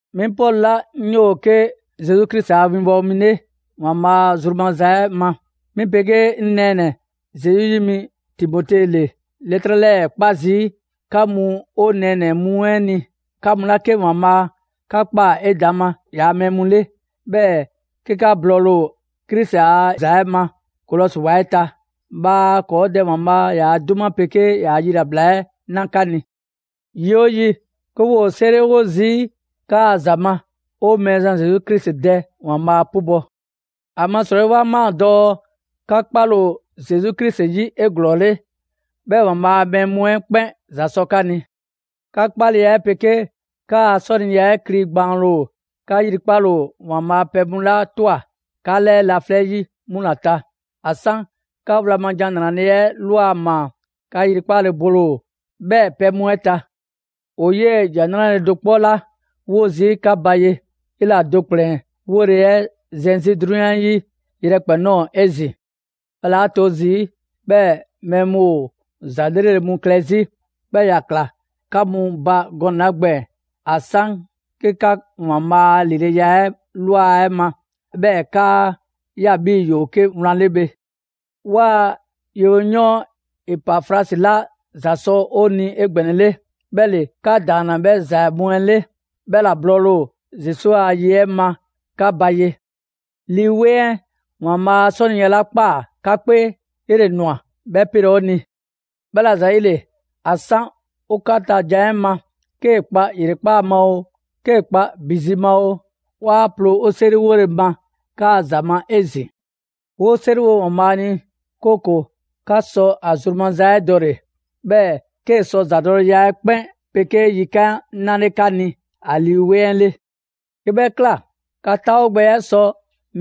'Mi Pɔlu 'la 'ŋ 'yoo‑ 'ke Zesu Krisi a winbɔwo mi 'le ‑Waanbhaa' zru maza ma, 'mi 'pegee 'ŋ nɛɛnɛ‑ Zesu 'yi mi Timote ‑le 'lɛtrɛ 'lɛɛ‑ 'kpa zii', 'ka mu 'o nɛɛnɛ‑ mu 'ɛ ni, 'ka mu 'la 'ke ‑Waanbhaa' 'ka ꞊kpaa 'edaŋma ‑yaa' mɛɛ mu 'le, 'bhɛɛ‑ 'ke 'ka blɔɔle‑ ‑o Krisi a ‑za 'ɛ ma Kolɔsi wa 'ɛ ta. Bhaa ‑kɔɔ' Dɛ ‑Waanbhaa' ‑yaa' 'duma 'pegee ‑yaa' yilabla 'ɛ 'na 'ka ni. Yi 'oo yi, 'ke 'woo‑ 'o 'seriwo zii' 'kaa‑ ‑za ma, 'o Mɛɛzan Zesu Krisi Dɛ ‑Waanbhaa' 'pubɔ‑. ‑Amasrɔyi 'wa ꞊maa dɔɔ 'ka 'kpale ‑o Zesu Krisi 'yi 'eglɔɔle, 'bhɛɛ‑ ‑Waanbhaa' a mɛɛ mu 'ɛ 'kpɛn ‑za sɔ 'ka ni. 'Kaa‑ 'kpaleya 'ɛ 'pegee 'kaa‑ 'sɔniya 'ɛ kli gbaanle ‑o 'ka 'yrikpale ‑o ‑Waanbhaa' pɛ mu 'la ꞊twa 'ka 'lɛɛ laflɛ' 'yi 'mu ‑la ta. ‑A 'san 'ka wlan ma ‑Jan 'Nrale‑ 'ɛ ꞊lwa ma, 'ka 'yrikpale bole ‑o 'bhɛɛ‑ pɛ mu 'ɛ ta. ‑O 'yee ‑Jan 'Nrale‑ do 'kpɔ 'la 'wo zii' 'ka ba ye, 'bhɛ ‑la do ‑kplɛn 'wole‑ 'ɛ zɛn 'zi 'drunyan 'ɛ 'yi yrɛkpɛn‑ ꞊nɔɔ 'ezin‑. 'Bhɛla‑ 'a 'to zii' 'bhɛɛ‑ mɛɛ mu ‑o ‑za 'lrele‑ mu klɛ 'zi, 'bhii‑ ‑ya ‑kla 'ka mu ba gɔnɛ‑ 'la gbɛɛn‑ ‑a 'san 'ke 'ka ‑Waanbhaa' a ‑lileya 'ɛ ꞊lwa 'ɛ ma, 'bhɛɛ‑ 'kaa ꞊ya 'bhii‑ ‑yoo 'ke wlan 'le bhe. 'Waa‑ yewoyɔɔn Epafrasi 'la ‑za sɔ 'o ni 'egbɛnɛle, 'bhɛ ‑le 'ka ‑daanna 'bhɛ ‑za mu 'ɛ 'le; 'bhɛ ‑la blɔɔle ‑o Krisi a ye 'ɛ ma 'ka ba ye. Lii 'Weŋ 'ɛ ‑Waanbhaa' a 'sɔniya 'la ꞊kpaa 'ka 'kpee, 'yele‑ ꞊nwa 'bhɛ 'pelɛ‑ 'o ni. 'Bhɛla‑ ‑zayile, ‑a 'san 'o 'ka ta jan 'ɛ ma, 'kee‑ kpa ‑yrekpaa' ma oo, 'kee kpa ‑bi zi ma oo, 'waa ploo 'o 'seriwole ma 'kaa‑ ‑za ma 'ezin‑. 'Woo 'seriwo ‑Waanbhaa' ni, 'kooko‑ 'ka sɔ ‑a zru maza 'ɛ dɔle‑; 'bhɛɛ‑ 'kee‑ sɔ ‑zadɔleya 'ɛ 'kpɛn 'pegee yikan' 'nale 'ka ni ‑a Lii 'Weŋ 'ɛ 'le. 'Ke 'bhɛ ꞊kla, 'ka 'taawogbɛya 'ɛ sɔ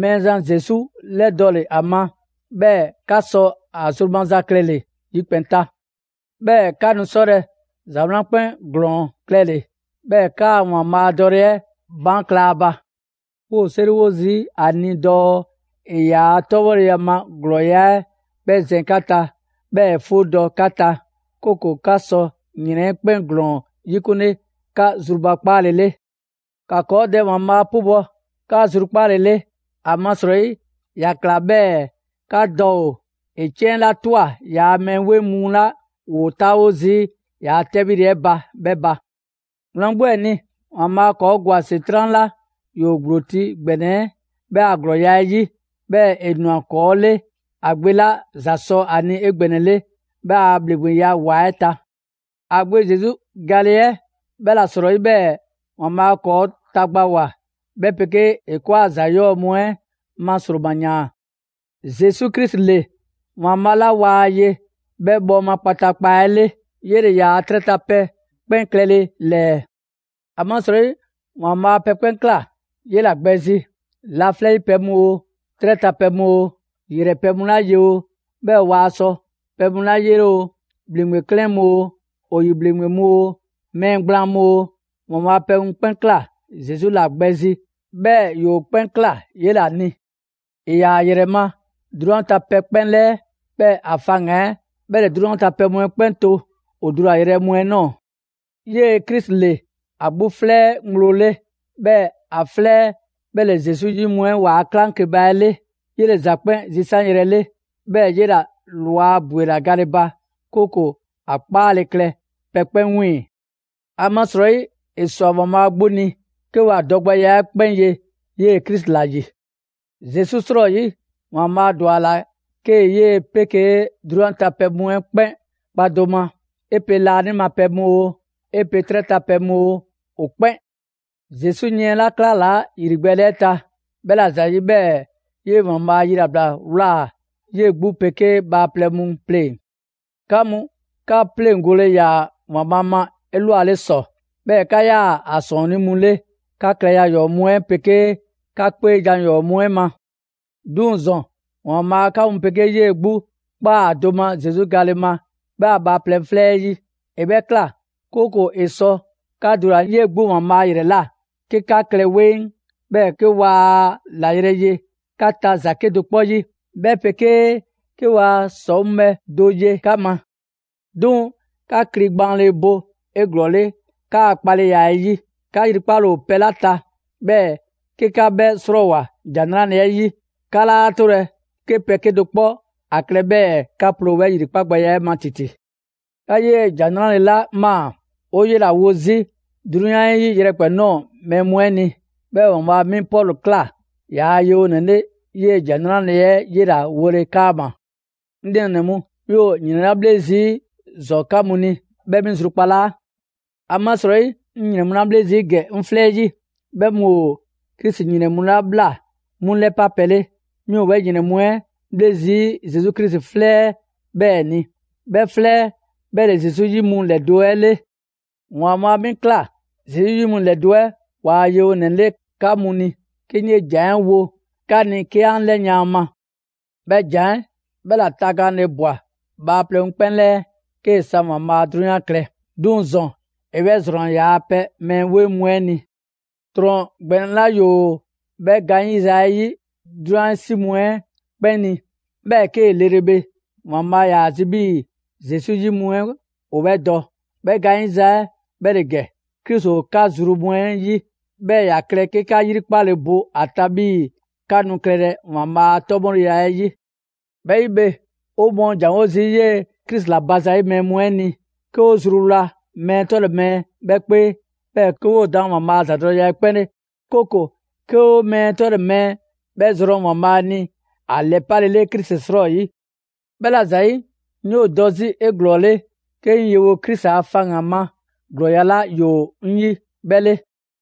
Mɛɛzan Zesu 'lɛdɔle ‑a ma, 'bhɛɛ‑ 'ka sɔ ‑a zru maza klɛle‑ yikpɛn‑ ta. 'Bhɛɛ‑ 'ka nu 'sɔlɛ‑ ‑za 'wlan 'kpɛn ‑glɔɔn klɛle‑, 'bhɛɛ‑ 'kaa‑ ‑Waanbhaa' dɔle 'ɛ baan' kla ‑a ba. 'Woo 'seriwo 'ezin‑ ‑a ni dɔɔ ‑e ‑yaa' 'tɔbhɔleya ma ‑glɔɔya' 'ɛ 'bhɛ zɛn 'ka ta, 'bhɛɛ‑ ‑e 'fuudɔ‑ 'ka ta, 'kooko‑ 'ka sɔ ‑yrɛn 'ɛ 'kpɛn ‑glɔɔn 'yikunle 'ka zrubakpaale 'le. ‑Ka ‑kɔɔ' Dɛ ‑Waanbhaa' 'pubɔ‑ 'ka zrukpaale 'le, ‑amasrɔyi, ‑ya ꞊kla 'bhɛɛ‑ 'ka dɔ ‑o ‑e 'ciɛn 'la ꞊twa ‑yaa' mɛɛ 'weŋ mu 'la ‑woo 'taawo zii' ‑yaa' 'tɛbhile 'ɛ ba 'bhɛ ba. Wlan 'gbu 'ɛ ni, ‑Waanbhaa' ‑kɔɔ' ‑gwa ‑Setran' 'la ‑yoo ‑gblo ti ‑gbɛnɛ 'ɛ 'yi 'bhɛ ‑a ‑glɔɔya' 'ɛ 'yi, 'bhɛɛ ‑e ‑nwa ‑kɔɔ' 'le ‑a Gbe 'la ‑za sɔ ‑a ni 'egbɛnɛle 'bhɛ a ‑bhleŋgbeya ‑wa 'ɛ ta. A Gbe Zesu gale 'ɛ 'bhɛla‑ 'srɔyi 'bhɛɛ‑ ‑Waanbhaa' ‑kɔɔ' tagbawoa, 'bhɛ 'pegee ‑e ‑kɔɔa' ‑za 'yɔɔ‑ mu 'ɛ ma ‑sroma ꞊yaan. Zesu Krisi ‑le ‑Waanbhaa' 'la waa ye 'bhɛ bhɔɔma kpataakpa 'ɛ 'le. 'Yele‑ ‑yaa 'trɛ ta pɛ 'kpɛn klɛle ‑lɛɛ. ‑Amasrɔyi ‑Waanbhaa' pɛ 'kpɛn ꞊kla 'yela‑ gbɛ zi: laflɛ' 'yi pɛ mu oo, 'trɛ ta pɛ mu oo, ‑yrɛ pɛ mu 'la ye oo, 'bhɛɛ‑ waa sɔ pɛ mu 'la 'yele oo, ‑bhleŋgbe 'klɛɛn mu oo, ‑o ‑yi ‑bhleŋgbe mu oo, mɛɛ gblaan mu oo, ‑Waanbhaa' pɛ 'kpɛn ꞊kla Zesu Krisi ‑la gbɛ zi, 'bhɛɛ‑ ‑yoo 'kpɛn ꞊kla 'yela‑ ni. ‑E ‑yaa ‑a ‑yrɛ ma 'drunyan ta pɛ 'kpɛn 'lɛɛ, 'bhɛɛ‑ ‑a faŋgan‑ 'ɛ 'bhɛ ‑le 'drunyan ta pɛ mu 'ɛ 'kpɛn to ‑o dulayrɛ mu 'ɛ ꞊nɔɔ. 'Yee‑ Krisi ‑le ‑a 'gbu 'flɛ 'ɛ ŋgblo 'le; 'bhɛɛ‑ ‑a 'flɛ 'ɛ 'bhɛ ‑le Zesu 'yi mu 'ɛ ‑waa' 'klaŋkeba 'ɛ 'le. 'Yele‑ ‑za 'kpɛn zisanyrɛ 'le; 'bhɛɛ‑ 'yela‑ ꞊lwa ‑bwela gale ba, 'kooko‑ ‑a 'kpaale klɛ pɛ 'kpɛn 'wiiŋ‑. ‑Amasrɔyi ‑e ‑swa ‑Waanbhaa' 'gbu ni 'ke ‑wa dɔgbɛya 'ɛ 'kpɛn ye 'yee‑ Krisi ‑la ‑yi. Zesu 'srɔyi, ‑Waanbhaa' ‑dwa ‑a ‑la 'kee‑ 'yee‑ 'pegee 'drunyan ta pɛ mu 'ɛ 'kpɛn kpa do ma: 'e pe laanima pɛ mu oo, 'e pe 'trɛ ta pɛ mu oo, ‑o 'kpɛn. Zesu yiɛn 'la 'klalaa ‑yrigbɛɛle 'ɛ ta, bhɛ ‑la ‑zayi' 'bhɛɛ‑ 'yee‑ ‑Waanbhaa' yilabla ꞊wlaa 'yee 'gbu 'pegee bhaaplɛŋ mu pleŋ‑. 'Ka mu, 'ka pleŋgole ‑yaa ‑Waanbhaa' ma 'elwale ‑sɔ, 'bhɛɛ‑ 'ka 'yaa‑ ‑a ‑sɔɔnnii' mu 'le 'ka klɛza ‑yɔɔ' mu 'ɛ 'pegee 'ka 'kpeejan‑ ‑yɔɔ' mu 'ɛ ma. 'Duŋ‑ ‑zɔn, ‑Waanbhaa' 'ka mu 'pegee 'yee‑ 'gbu ꞊kpaa do ma Zesu gale ma 'bhɛ a bhaaplɛŋ 'flɛ 'ɛ 'yi. ‑E 'bhɛ ꞊kla, 'kooko‑ ‑e sɔ 'ka dulale' 'yee‑ 'gbu ‑Waanbhaa' 'yrɛ ꞊la 'ke 'ka klɛ 'weŋ, 'bhɛɛ‑ 'ke waa ‑la yrɛ ye 'ka ta ‑za 'kedo‑ 'kpɔ 'yi, 'bhɛ 'pegee 'ke waa ‑sɔŋ' bhɛ do ye 'ka ma. 'Duŋ‑ 'ka kli gbaanle bo 'eglɔɔle 'kaa‑ 'kpaleya 'ɛ 'yi; 'ka 'yrikpale ‑o pɛ 'la ta, 'bhɛɛ‑ 'ke 'ka 'bhɛ 'srɔɔwoa‑ ‑Jan 'Nrale‑ 'ɛ 'yi, 'ka 'laa 'tolɛ‑ 'ke pɛ 'kedo‑ 'kpɔ 'a klɛ 'bhɛɛ‑ 'ka ploo 'bhɛ ‑yrikpagbɛya 'ɛ ma ‑titi. 'Ka 'yee‑ ‑Jan 'Nrale‑ 'la ꞊maa, ‑o 'yela‑ wo 'zi 'drunyan 'ɛ 'yi yrɛkpɛn‑ ꞊nɔɔ mɛɛ mu 'ɛ ni; 'bhɛɛ‑ ‑Waanbhaa' 'mi Pɔlu ꞊kla ‑yaa' yewonɛ 'le 'yee‑ ‑Jan 'Nrale‑ 'ɛ 'yela‑ wole 'kaama‑. 'Ŋ nɛɛnɛ‑ mu, 'mi ‑o ‑yrɛnlabhle zii' ‑zɔn 'ka mu ni, 'bhɛ 'mi zrukpalaa. ‑Amasrɔyi, 'ŋ ‑yrɛn mu 'la 'bhle zii' ‑gɛ 'ŋ 'flɛ 'yi, 'bhɛ mu ‑o Krisi ‑yrɛn mu 'la ꞊bhla 'mu ‑lɛpa' pɛ 'le. 'Mi ‑o 'bhɛ ‑yrɛn mu 'ɛ 'bhle zii' Zesu Krisi 'flɛ 'ɛ 'bhɛɛ‑ ni; 'bhɛ 'flɛ 'ɛ 'bhɛ ‑le Zesu 'yi mu ‑lɛdo' 'ɛ 'le. ‑Waanbhaa' 'mi ꞊kla Zesu 'yi mu ‑lɛdo' 'ɛ ‑waa' yewonɛ 'le 'ka mu ni, 'ke 'ŋ 'yee‑ ‑jan 'ɛ wo 'ka ni 'ke 'an 'lɛyan a ma. 'Bhɛ ‑jan 'ɛ 'bhɛ ‑la tagaanle ꞊bwa bhaaplɛŋ mu 'kpɛn 'lɛɛ, 'kee‑ 'san ‑Waanbhaa' 'drunyan klɛ. 'Duŋ‑ ‑zɔn, ‑e 'bhɛ ‑zrɔnna ‑yaa' pɛ mɛɛ 'weŋ mu 'ɛ ni. ‑Trɔn ‑gbɛnɛ 'la ‑yoo 'bhɛ gaanyiza 'ɛ 'yi 'drunyan 'yi 'si mu 'ɛ 'kpɛn ni, 'bhɛɛ‑ 'kee‑ lele bhe, ‑Waanbhaa' ‑yaa ‑a zi 'bhii‑ Zesu 'yi mu 'ɛ ‑o 'bhɛ dɔ. 'Bhɛ gaanyiza 'ɛ 'bhɛ ‑le ‑gɛ: Krisi ‑o 'ka zru mu 'ɛ 'yi, 'bhɛɛ‑ ‑ya klɛ 'ke 'ka 'yrikpale bo ‑a ta 'bhii‑ 'ka nu klɛlɛ ‑Waanbhaa' a 'tɔbhɔleya 'ɛ 'yi. 'Bhɛ 'yi bhe, 'o mɔɔ ‑janwo' zii' 'yee‑ Krisi ‑la ba zayi' mɛɛ mu 'ɛ ni, 'ke 'o zruwla mɛɛ 'tɔle‑ mɛɛ 'bhɛ 'kpee, 'bhɛɛ‑ 'ke 'woo‑ daan ‑Waanbhaa' a ‑zadɔleya 'ɛ 'kpɛn 'le. 'Kooko‑ 'ke 'o mɛɛ 'tɔle‑ mɛɛ 'bhɛ zrɔn ‑Waanbhaa' ni ‑a ‑lɛpalele Krisi 'srɔyi. 'Bhɛla‑ ‑zayi', 'ŋ 'yoo‑ dɔ 'zi 'eglɔɔle 'ke 'ŋ yewo Krisi a faŋgan‑ ma ‑glɔɔya' 'la ‑yoo 'ŋ 'yi 'bhɛ 'le.